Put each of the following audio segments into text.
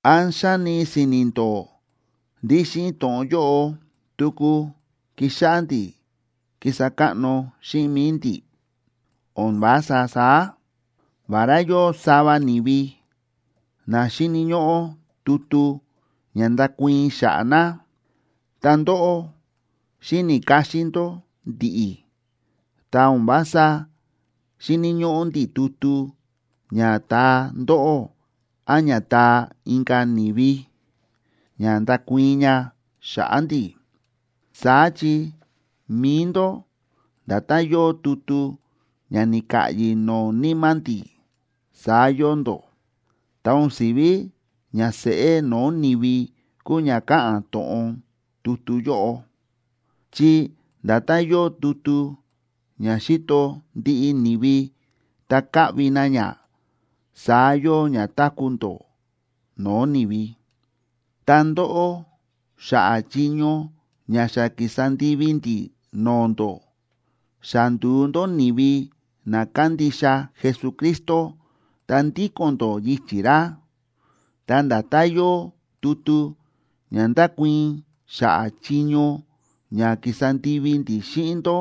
¿Án xáni si̱ni̱ ndó ndí xíꞌin to̱ꞌon yóꞌo tuku ki̱xáꞌá ndi̱ kísa káꞌno xíꞌin mi̱i ndi̱? ¡O̱n vása saá! Vará yóo sava ni̱vi na xíni̱ ñóꞌó tutu ña ndákuii̱n xa̱ꞌa̱ na, ta ndóꞌó xíni̱ káxín ndó ndi̱ꞌi̱, ta o̱n vása xíni̱ ñóꞌó ndi̱ tutu ña taa ndóꞌó án ña taa inka̱ ni̱vi, ña ndákuii̱n ña xa̱ꞌa̱ ndi̱. Saá chi mi̱i ndó nda̱tán yóo tutu ña ni̱ka̱ꞌyi̱ no̱o̱ níma̱ ndi̱, saá yóo ndó. Ta o̱n si̱ví ña seꞌé no̱o̱ ni̱vi kúu ña káꞌa̱n to̱ꞌon tutu yóꞌo, chi nda̱tán yóo tutu ña xíto ndiꞌi ni̱vi ta káꞌvi na ña, saá yóo ña táku̱ ndó no̱o̱ ni̱vi. Ta ndóꞌó, xa̱ꞌa̱ chiño ña xa ki̱sa ndivi ndi̱ no̱o̱ ndó, xa ndu̱u ndó ni̱vi na kándixa Jesucristo ta ndíko̱n ndó yichi̱ ra. Ta nda̱tán yóo tutu ña ndákuii̱n xa̱ꞌa̱ chiño ña ki̱sa ndivi ndi̱ xíꞌin ndó,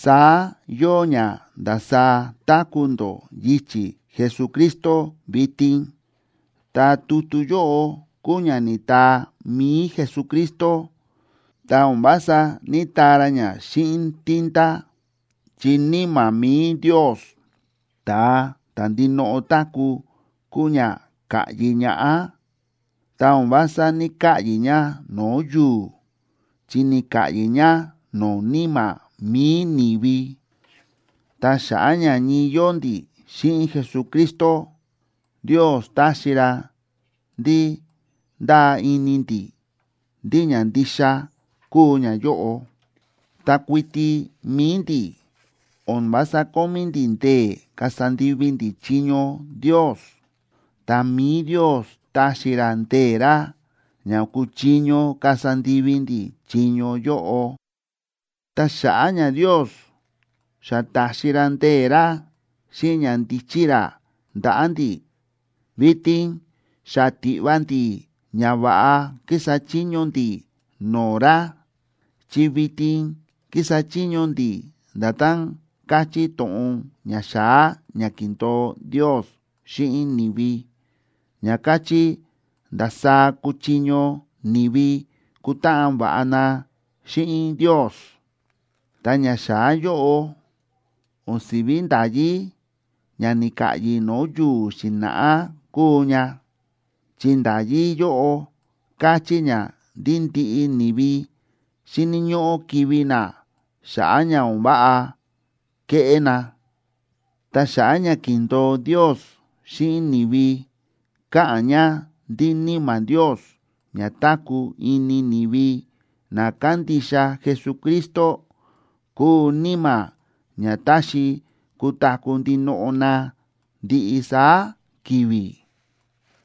saá yóo ña ndasaá táku̱ ndó yichi̱ Jesucristo vitin. Ta tutu yóꞌo kúu ña ni̱taa mi̱i Jesucristo, ta o̱n vása ní‑taa ra xíꞌin tinta, chi Níma̱ mi̱i Ndios, ta̱a ta̱ ndinoꞌo táku̱, kúu ña ka̱ꞌyi ñaꞌá. Ta o̱n vása ní‑kaꞌyi̱ ña no̱o̱ yu̱u̱, chi ni̱ka̱ꞌyi̱ ña no̱o̱ níma̱ mi̱i ni̱vi. Ta xa̱ꞌa̱ ña ñii yóo ndi̱ xíꞌin Jesucristo, Ndios táxi ra ndí ndáa ini ndi̱ ndí ña ndixa kúu ñayóꞌo. Ta kuiti mi̱i ndi̱ o̱n vása kómí ndi̱ ndee̱ kasa ndivi ndi̱ chiño Ndios, ta mi̱i Ndios táxi ra ndee̱ ra ña kúchiño kasa ndivi ndi̱ chiño yóꞌo. Ta xa̱ꞌa̱ ña Ndios xa ta̱xi ra ndee̱ ra xíꞌin ñandíchí ra ndaꞌa̱ ndi̱, vitin xa tiꞌva ndi̱ ña va̱ꞌa kísa chiño ndi̱ no̱o̱ ra, chi vitin kísa chiño ndi̱ nda̱tán káchí to̱ꞌon ñaxa̱á ña ki̱ndo̱o Ndios xíꞌin ni̱vi, ña káchí ndasaá kuchiño ni̱vi kutáꞌan va̱ꞌa na xíꞌin Ndios. Ta ñaxa̱á yóꞌo o̱n si̱ví nda̱yí ña ni̱ka̱ꞌyi̱ no̱o̱ yu̱u̱ xi̱na̱ꞌá kúu ña, chi nda̱yí yóꞌo káchí ña ndí ndiꞌi ni̱vi xíni̱ ñóꞌó kivi̱ na xa̱ꞌa̱ ña o̱n váꞌa ke̱ꞌé na. Ta ñaxa̱á ña ki̱ndo̱o Ndios xíꞌin ni̱vi káꞌa̱n ña ndí Níma̱ Ndios ña táku̱ ini ni̱vi na kándixa Jesucristo kúu Níma̱ ña táxi kutaku̱ ndinoꞌo na ndiꞌi saá ki̱vi̱.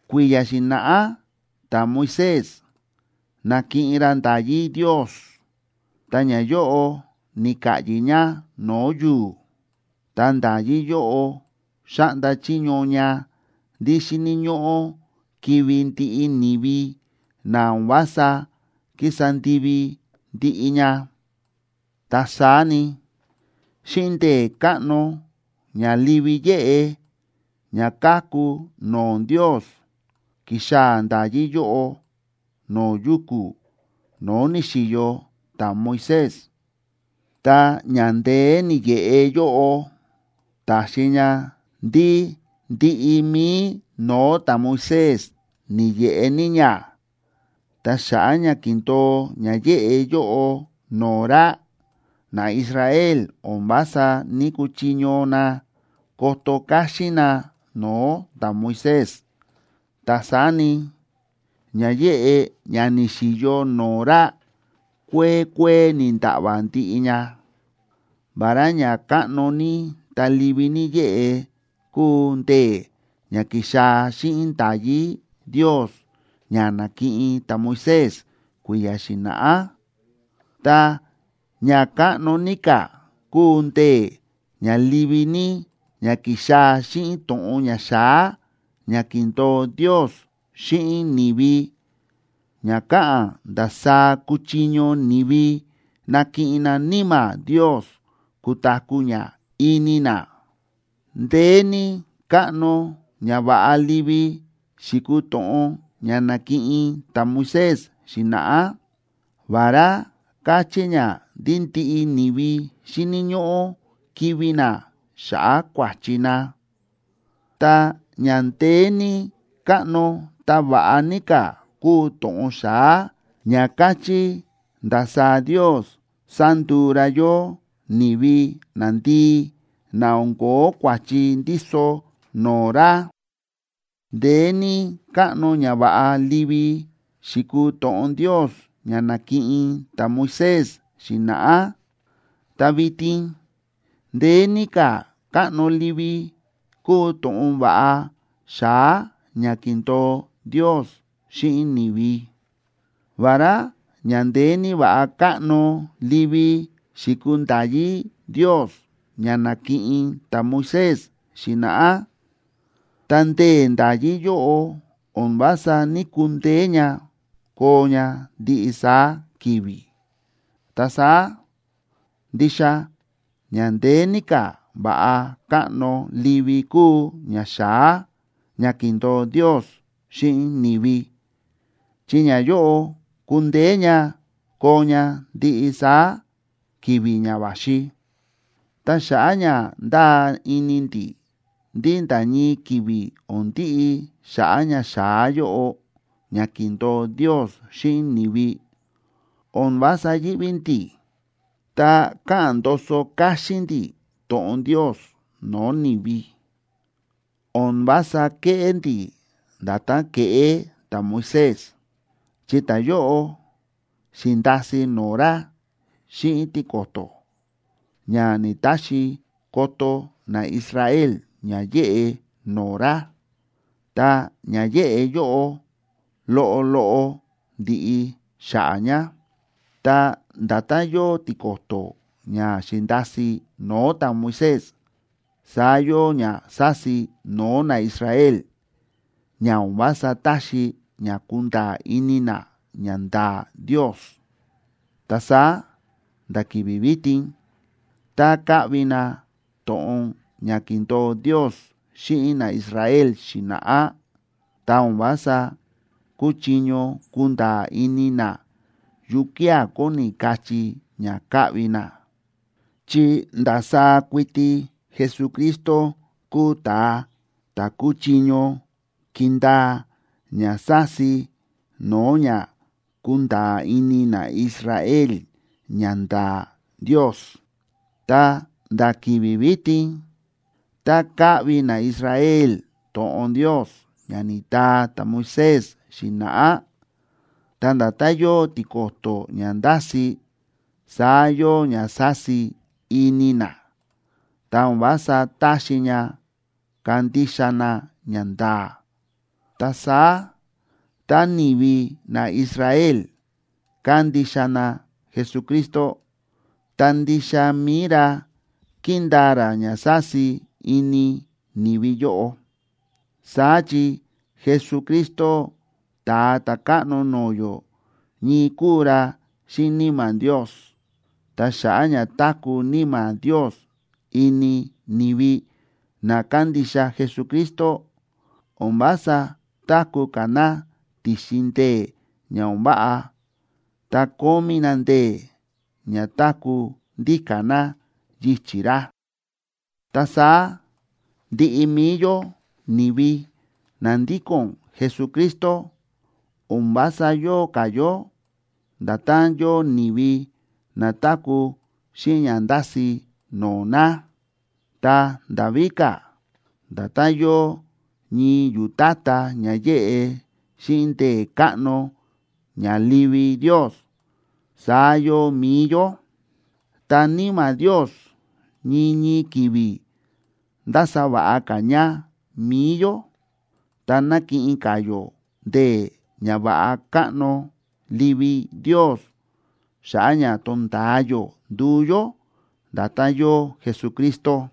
Kui̱ya̱ xi̱na̱ꞌá ta̱Moisés na̱kiꞌin ra nda̱yí Ndios ta ñayóꞌo ni̱ka̱ꞌyi̱ ña no̱o̱ yu̱u̱. Ta nda̱yí yóꞌo xáꞌnda chiño ña ndí xíni̱ ñóꞌó kivi̱ ndiꞌi ni̱vi na o̱n vása kísa ndivi ndiꞌi ña. Ta saá ni, xíꞌin ndee̱ káꞌno ña livi yéꞌe ña káku no̱o̱ Ndios ki̱xaa̱ nda̱yí yóꞌo no̱o̱ yuku̱ no̱o̱ ni̱xi̱yo ta̱Moisés. Ta ña ndeé ni̱yeꞌe yóꞌo ta̱xi ña ndí ndiꞌi mi̱i no̱o̱ ta̱Moisés ni̱yeꞌe ní ña, ta xa̱ꞌa̱ ña ki̱ndo̱o ña yéꞌe yóꞌo no̱o̱ ra, naIsrael o̱n vása ní‑kuchiño na koto káxín na no̱o̱ ta̱Moisés. Ta saá ni, ña yéꞌe ña ni̱xi̱yo no̱o̱ ra kuee kuee ni̱nda̱ꞌva̱ ndiꞌi ña. Vará ña káꞌno ní ta livi ní yéꞌe kúu ndee̱ ña ki̱xaa̱ xíꞌin nda̱yí Ndios ña na̱kiꞌin ta̱Moisés kui̱ya̱ xi̱na̱ꞌá, ta ña káꞌno ní ka̱ kúu ndee̱ ña livi ní ña ki̱xaa̱ xíꞌin to̱ꞌon ñaxa̱á ña ki̱ndo̱o Ndios xíꞌin ni̱vi, ña káꞌa̱n ndasaá kúchiño ni̱vi nakiꞌin na Níma̱ Ndios kutaku̱ ña ini na. Ndeé ní káꞌno ñava̱ꞌa livi xi̱kuu to̱ꞌon ña na̱kiꞌin ta̱Moisés xi̱na̱ꞌá, vará káchí ña ndí ndiꞌi ni̱vi xíni̱ ñóꞌó kivi̱ na xa̱ꞌa̱ kua̱chi na. Ta ña ndeé ní káꞌno ta va̱ꞌa ní ka̱ kúu to̱ꞌon xa̱á, ña káchí ndasaá Ndios sánduu ra yó ni̱vi nandii, na o̱n ko̱ó kua̱chi ndíso no̱o̱ ra. Ndeé ní káꞌno ñava̱ꞌa livi xi̱kuu to̱ꞌon Ndios ña na̱kiꞌin ta̱Moisés xi̱na̱ꞌá, ta vitin ndeé ní ka̱ káꞌno livi kúu to̱ꞌon va̱ꞌa xa̱á ña ki̱ndo̱o Ndios xíꞌin ni̱vi. Vará ña ndeé ní va̱ꞌa káꞌno livi xi̱kuu nda̱yí Ndios ña na̱kiꞌin ta̱Moisés xi̱na̱ꞌá, ta ndee̱ nda̱yí yóꞌo o̱n vása ní‑kundeé ña koo ña ndiꞌi saá ki̱vi̱. Ta saá ndixa ña ndeé ní ka̱ va̱ꞌa káꞌno livi kúu ñaxa̱á ña ki̱ndo̱o Ndios xíꞌin ni̱vi, chi ñayóꞌo kundeé ña koo ña ndiꞌi saá ki̱vi̱ ña va̱xi. Ta xa̱ꞌa̱ ña ndáa ini ndi̱ ndí nda̱ ñii ki̱vi̱ o̱n ndiꞌi xa̱ꞌa̱ ñaxa̱á yóꞌo ña ki̱ndo̱o Ndios xíꞌin ni̱vi, o̱n vása yíꞌví ndi̱, ta káꞌa̱n ndoso káxín ndi̱ to̱ꞌon Ndios no̱o̱ ni̱vi. O̱n vása kéꞌé ndi̱ nda̱tán ke̱ꞌé ta̱Moisés, chi ta̱yóꞌo xi̱ndasi no̱o̱ ra xíꞌin tiko̱to̱, ña ni̱‑taxi koto naIsrael ña yéꞌe no̱o̱ ra, ta ña yéꞌe yóꞌo loꞌo loꞌo ndíꞌi xa̱ꞌa̱ ña. Ta nda̱tán yóo tiko̱to̱ ña xi̱ndasi no̱o̱ ta̱Moisés, saá yóo ña sási no̱o̱ naIsrael, ña o̱n vása táxi ña kunda̱a̱ ini na ñanda̱a̱ Ndios. Ta saá nda̱ ki̱vi̱ vitin, tá káꞌvi na to̱ꞌon ña ki̱ndo̱o Ndios xíꞌin naIsrael xi̱na̱ꞌá, ta o̱n vása kúchiño kunda̱a̱ ini na yukía̱ kóni kachí ña káꞌvi na, chi ndasaá kuiti Jesucristo kúu ta̱a ta̱ kúchiño kindaa ña sási no̱o̱ ña kunda̱a̱ ini naIsrael ñanda̱a̱ Ndios. Ta nda̱ ki̱vi̱ vitin, tá káꞌvi naIsrael to̱ꞌon Ndios ña ni̱taa ta̱Moisés xi̱na̱ꞌá, ta nda̱tán yóo tiko̱to̱ ña ndási, saá yóo ña sási ini na, ta o̱n vása táxi ña kandixa na ñanda̱a̱. Ta saá tá ni̱vi naIsrael kándixa na Jesucristo, ta ndixa mi̱i ra kíndaa ra ña sási ini ni̱vi yóꞌo. Saá chi Jesucristo Ta̱a Ta̱káꞌno no̱o̱ yó ñii kúu ra xíꞌin Níma̱ Ndios. Ta xa̱ꞌa̱ ña táku̱ Níma̱ Ndios ini ni̱vi na kándixa Jesucristo, o̱n vása táku̱ ka̱ na ti̱xin ndee̱ ña o̱n váꞌa, ta kómí na ndee̱ ña táku̱ ndíka̱ na yichi̱ ra. Ta saá ndiꞌi mi̱i yó ni̱vi na ndíko̱n Jesucristo, o̱n vása yóo ka̱ yó nda̱tán yóo ni̱vi na táku̱ xíꞌin ña ndási no̱o̱ na. Ta nda̱ víka̱, nda̱tán yóo ñii yu̱tátá ña yéꞌe xíꞌin ndee̱ káꞌno ña livi Ndios, saá yóo mi̱i yó. Ta Níma̱ Ndios ñii ñii ki̱vi̱ ndása va̱ꞌa ka̱ ña mi̱i yó, ta nákiꞌin ka̱ yó ndee̱ ñava̱ꞌa káꞌno livi Ndios xa̱ꞌa̱ ña tonda̱a yó nduu yó nda̱tán yóo Jesucristo.